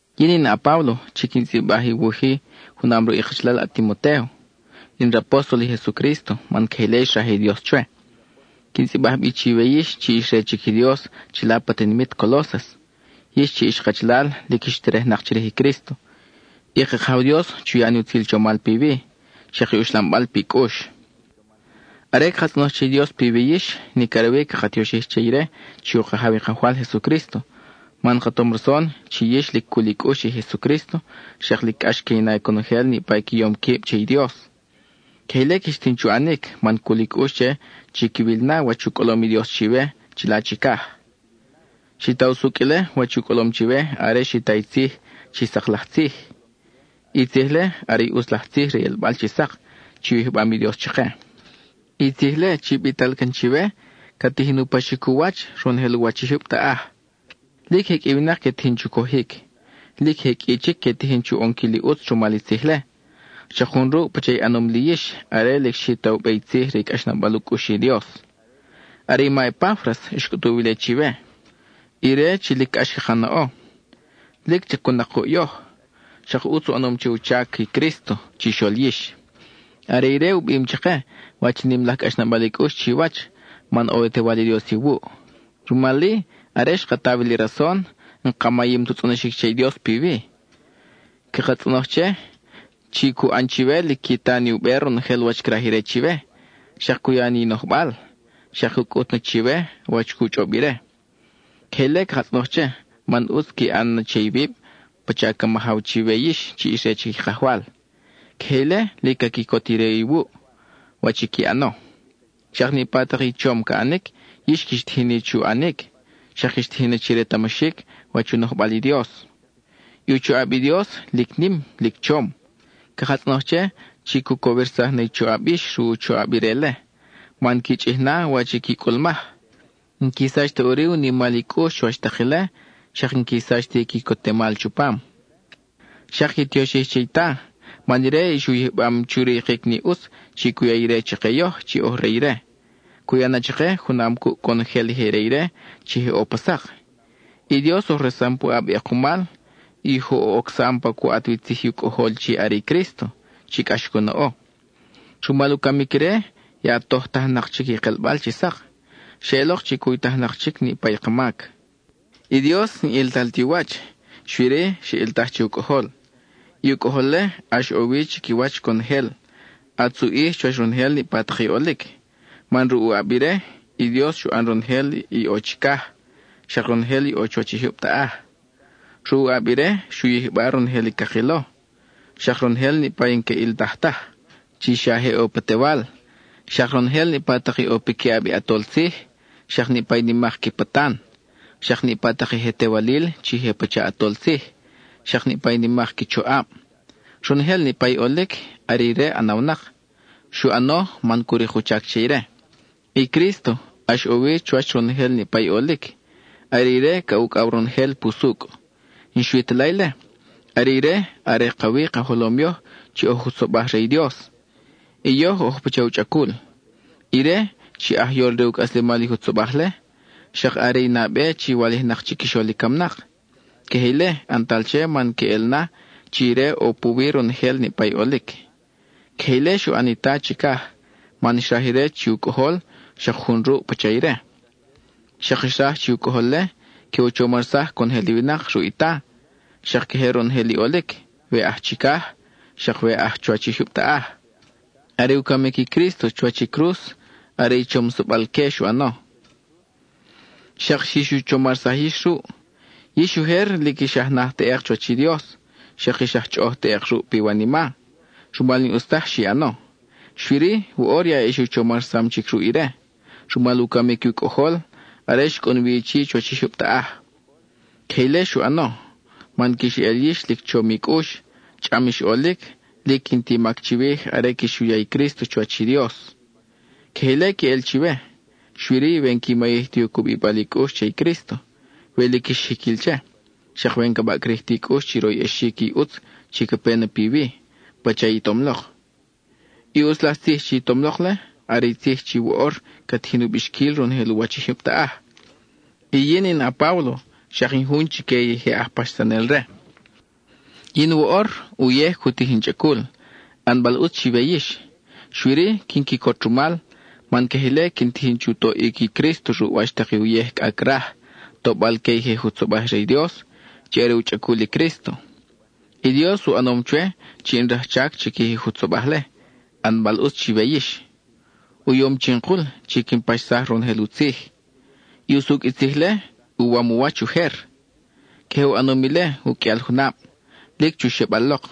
Yin in a-Páblo chi quin tzʼibaj i wuj-i, junam ruʼ i kachalal a-Timotéo. In rapóstol i Jesucrísto man queje ile xraj i Dios chwe. Quin tzʼibaj bi chiwe yix chi ix re chic i Dios chila pa tinimit Colósas, yix chi ix kachalal lic ix terejnak chirij i Crísto. I ka Kajaw Dios chu ya ni utzil chomal piwi, xak i uxlambal pi cʼux. Are caka tzʼonoj che i Dios piwi yix, nic are wi caka tioxij che ire chi u Kajaw i Kajwal Jesucrísto, man ka tom rason chi yix lic cul i cʼux che i Jesucrísto, xak lic cʼax que i na conojel niʼpa i qui yom quib che i Dios. Queje ile quix tijin chu ʼanic man cul i cʼux che chi quiwil na wach u cʼolom i Dios chiwe chila chicaj. Xi ta usucʼ ile wach u cʼolom chiwe are xi ta i tzij chi sak laj tzij; i tzij-le are i ʼutz laj tzij re i ʼelbal chi sak chi u yijbam i Dios chake. I tzij-le chi bital can chiwe, ca tijin u paxic u wach ronojel u wach i jyub taʼaj; lic je qʼui i winak que tijin chu cojic. Lic je qʼui chic que tijin chu ʼonquil i ʼutz rumal i tzij-le, xak jun ruʼ pacha i ʼanom li yix are lic xi ta u be i tzij re i cʼaxnabal u cʼux i Dios. Are i ma Epáfras xcʼutuw ile chiwe, ire chi lic cʼax caka naʼo. Lic chacun-nak kuʼ yoj, xak ʼutz u ʼanom che u chac i Crísto chixol yix. Are ire u bim chake wach i nim laj cʼaxnabal i cʼux chiwach, man ʼo i u Tewal i Dios iwuʼ. Rumal-i, are xka ta wi li rason, n-ka mayim tu tzʼonoxic che i Dios piwi; caka tzʼonoj che, chi cu ʼan chiwe lic qui ta ni u be ronojel wach craj ire chiwe, xak cu ya ni i nojbal, xak cu cʼut na chiwe wach cu chʼob ire. Queje ile caka tzʼonoj che, man ʼutz qui ʼan na che iwib pacha ca majaw chiwe yix chi ix re chic i Kajwal. Queje ile, lic ca quicot ire iwuʼ, wach i qui ʼano. Xak niʼpa tak i chom ca ʼanic, yix quix tijin ni chu ʼanic, xak quix tijin na chi retamaxic wach u nojbal i Dios. I u choʼab i Dios, lic nim, lic chom. Caka tzʼonoj che chi cu cowirsaj na i choʼab yix ruʼ u choʼab ire-le, man qui chʼij na wach i qui cʼulmaj. N-qui sach ta ʼuri u nimal i cʼux chuwach tak ile, xak n-qui sach ti i quicotemal chupam, xak qui tioxij che i Ta, man ire ix u yijbam chu rikic ni ʼutz chi cu ya ire chake yoj chi oj re ire. Cu ya na chake, junam cuʼ conojel i je re ire chi je ʼo pa sak. I Dios oj resam puʼab i ʼekumal, y oj u ocsam pa cu ʼat wi tzij i u Cʼojol chi are i Crísto, chi cʼax cu naʼo. Rumal u camic ire, ya tojtajnak chic i kelbal chi sak; xeʼelok chi cuytajnak chic niʼpa i ka mac. I Dios, n-ʼiltal ti u wach, xui-ri, xa ʼiltaj che u Cʼojol. I u Cʼojol-le, ʼax ʼo wi chiquiwach conojel, ʼatz u ʼij chuwach ronojel niʼpa tak i ʼolic, man ruʼ u ʼab ire, i Dios xu ʼan ronojel i ʼo chicaj, xak ronojel i ʼo chuwach i jyub taʼaj. Ruʼ u ʼab ire, xu yijba ronojel i cakilo, xak ronojel niʼpa i n-que ʼiltaj taj, chi xa je ʼo pa tewal, xak ronojel niʼpa tak i ʼo piquiʼab i ʼatol tzij, xak niʼpa i nimak qui patan; xak niʼpa tak i je tewalil chi je pacha ʼatol tzij, xak niʼpa i nimak qui choʼab. Ronojel niʼpa i ʼolic, are ire ʼanawnak; xu ʼano man cu rik u chac che ire. I Crísto, ʼax ʼo wi chuwach ronojel niʼpa i ʼolic; are ire ca ucʼaw ronojel pusucʼ. Y n-xui ta la ile, are ire are ka wi ka jolom yoj chi oj jutzobaj re i Dios, y yoj oj pacha u chʼacul. Ire, chi aj yol re u cʼaslemal i jutzobaj-le, xak are i nabe chi walijnak chiquixol i camnak. Queje ile ʼantal che man queʼel na chi ire ʼo puwi ronojel niʼpa i ʼolic. Queje ile xu ʼan i Ta chicaj man xraj ire chi u Cʼojol xak jun ruʼ pacha ire. Xak xraj chi u Cʼojol-le que u chomarsaj conojel i winak ruʼ i Ta, xak queje ronojel i ʼolic, we aj chicaj, xak we aj chuwach i jyub taʼaj. Are u camic i Crísto chuwach i cruz, are i chomsabal-que xu ʼano. Xak xix u chomarsaj yix ruʼ. Yix ujer lic ix aj naj teʼek chuwach i Dios, xak ix aj chʼoʼoj teʼek ruʼ piwanima, rumal i n-ʼus taj xi ʼano. Xui-ri, woʼor ya ix u chomarsam chic ruʼ ire, rumal u camic u Cʼojol, are xcʼun wi chi chuwach i jyub taʼaj. Queje ile xu ʼano, man quix eʼel yix lic chom i cʼux, chʼam ix ʼolic, lic n-ti mac chiwij are quix u ya i Crísto chuwach i Dios. Queje ile queʼel chiwe, xui-ri we n-qui mayij ti u cubibal i cʼux che i Crísto, we lic ix jiquil che, xak we n-ca baʼcrij ta i cʼux chi royʼexic i ʼutz chi ca pe na piwi pacha i tom lok. I ʼutz laj tzij chi i tom lok-le, are i tzij chi woʼor ca tijin u bixquil ronojel u wach i jyub taʼaj; y yin in a-Páblo xak in jun chique i je aj paxsanel-re. Yin woʼor, uyej cu tij in chʼacul, ʼanbal ʼutz chiwe yix. Xui-ri, quin quicot rumal, man queje ile quin tijin chu toʼic i Crísto ruʼ wach tak i uyej cʼa craj, tobal que i je jutzobaj re i Dios, chi are u chʼacul i Crísto. I Dios u ʼanom chwe chi in rajchac chiquij i jutzobaj-le, ʼanbal ʼutz chiwe yix. U yom chinkul, chi quin paxsaj ronojel i u tzij. I usucʼ i tzij-le, uwam u wach ujer; queje u ʼanom ile u qʼuial junab, lic chu xebal lok.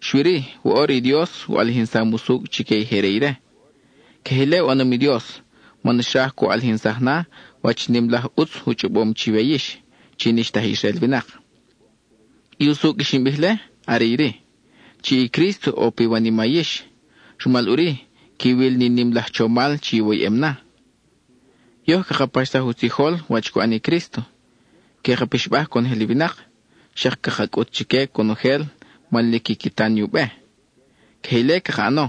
Xui-ri, woʼor i Dios u ʼalijinsam usucʼ chique i je re ire. Queje ile u ʼanom i Dios man xraj cu ʼalijinsaj na wach i nim laj ʼutz u chʼobom chiwe yix chi n-ix ta aj Israel winak. I usucʼ i xin bij-le are iri: chi i Crísto ʼo piwanima yix, rumal ʼuri, quiwil ni nim laj chomal chi iwoyʼem na. Yoj caka paxsaj u tzijol wach cu ʼan i Crísto. Que ka pixbaj conojel i winak, xak caka cʼut chique conojel man lic quiqui ta ni u be. Queje ile caka ʼano,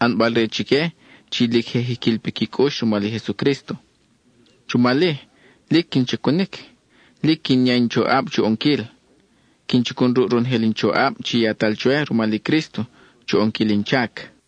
ʼanbal-re chique chi lic je jiquil piqui cʼux rumal i Jesucrísto. Rumal-i, lic quin chacunic, lic quin ya in choʼab chu ʼonquil. Quin chacun ruʼ ronojel in choʼab chi yatal chwe rumal i Crísto chu ʼonquil in chac.